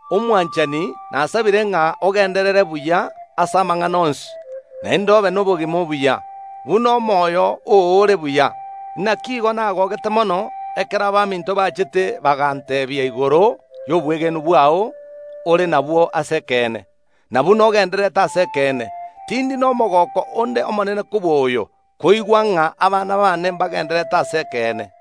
Omwanchani, nasabire ng’a ogenderere buya ase amang’ana onsi, naende obe nobogima obuya, buna omoyo oo ore buya. Naki igo nagogete mono ekero abaminto bachete baganteebia igoro y’obwegenwa bwao ore nabwo ase ekeene, na buna ogendererete ase ekeene. Tindi nomogooko onde omonene kobua oyo, koigwa ng’a abana baane mbagendererete ase ekeene.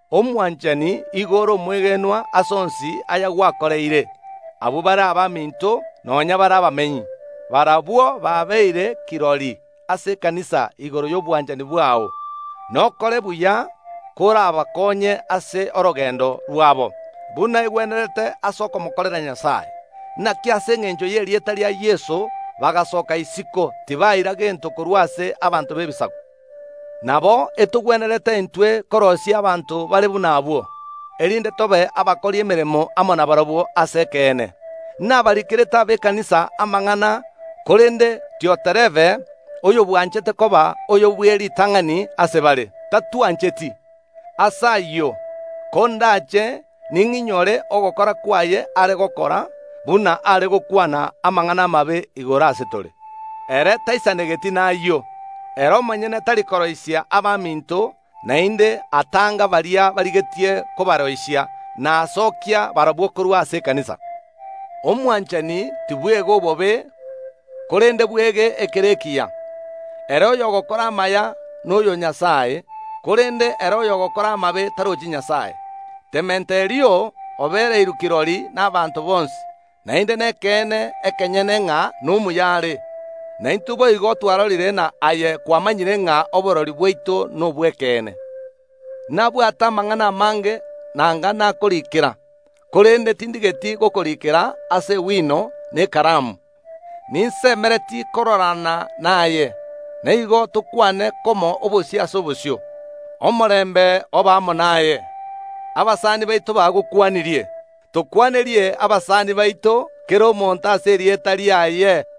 Omwanchani, igo ore omwegenwa ase onsi ayagwakoreire abwo bare abaminto, nonya bare abamenyi. Barabwo babeire kirori ase ekanisa igoro y’obwanchani bwao. Nokore buya korabakonye ase orogendo rwabo, buna egwenerete ase okomokorera Nyasae. Naki ase engencho y’erieta ria Yeso bagasooka isiko, tibaira gento korwa ase abanto b’Ebisaku. Nabo etogwenerete intwe koroisia abanto bare buna abwo, erinde tobe abakori emeremo amo nabarabwo ase ekeene. Nabarikerete abekanisa amang’ana, korende Dioterefe, oyobwanchete koba oyo bw’eritang’ani ase bare, tatwancheti. Ase ayio, kondache ning’inyore ogokora kwaye are gokora, buna are gokwana amang’ana amabe igoro ase tore. Ere taisanegeti nayio, ere omonyene tari koroisia abaminto, naende atanga baria barigetie kobaroisia, na aosokia barabwo korwa ase ekanisa. Omwanchani, tibwega obobe, korende bwege ekere ekiya. Ere oyogokora amaya noyo o Nyasae, korende ere oyogokora amabe tarochi Nyasae. Demeturio obereirwe kirori nabaanto bonsi, naende nekeene ekenyene, ng’a nomuya are. Na intwe boigo twarorire, na aye kwamanyire ng’a oborori bwaito nobw’ekeene. Nabwate amang’ana amange nanga nakoriikera, korende tindigeti gokoriikera ase ewino na ekaramu. Ninsemeretie kororana naye, na igo tokwane komo obosio ase obosio. Omorembe obe amo naye. Abasani bao bagokwanirie. Tokwanerie abasani baito, kera omonto ase erieta riaye.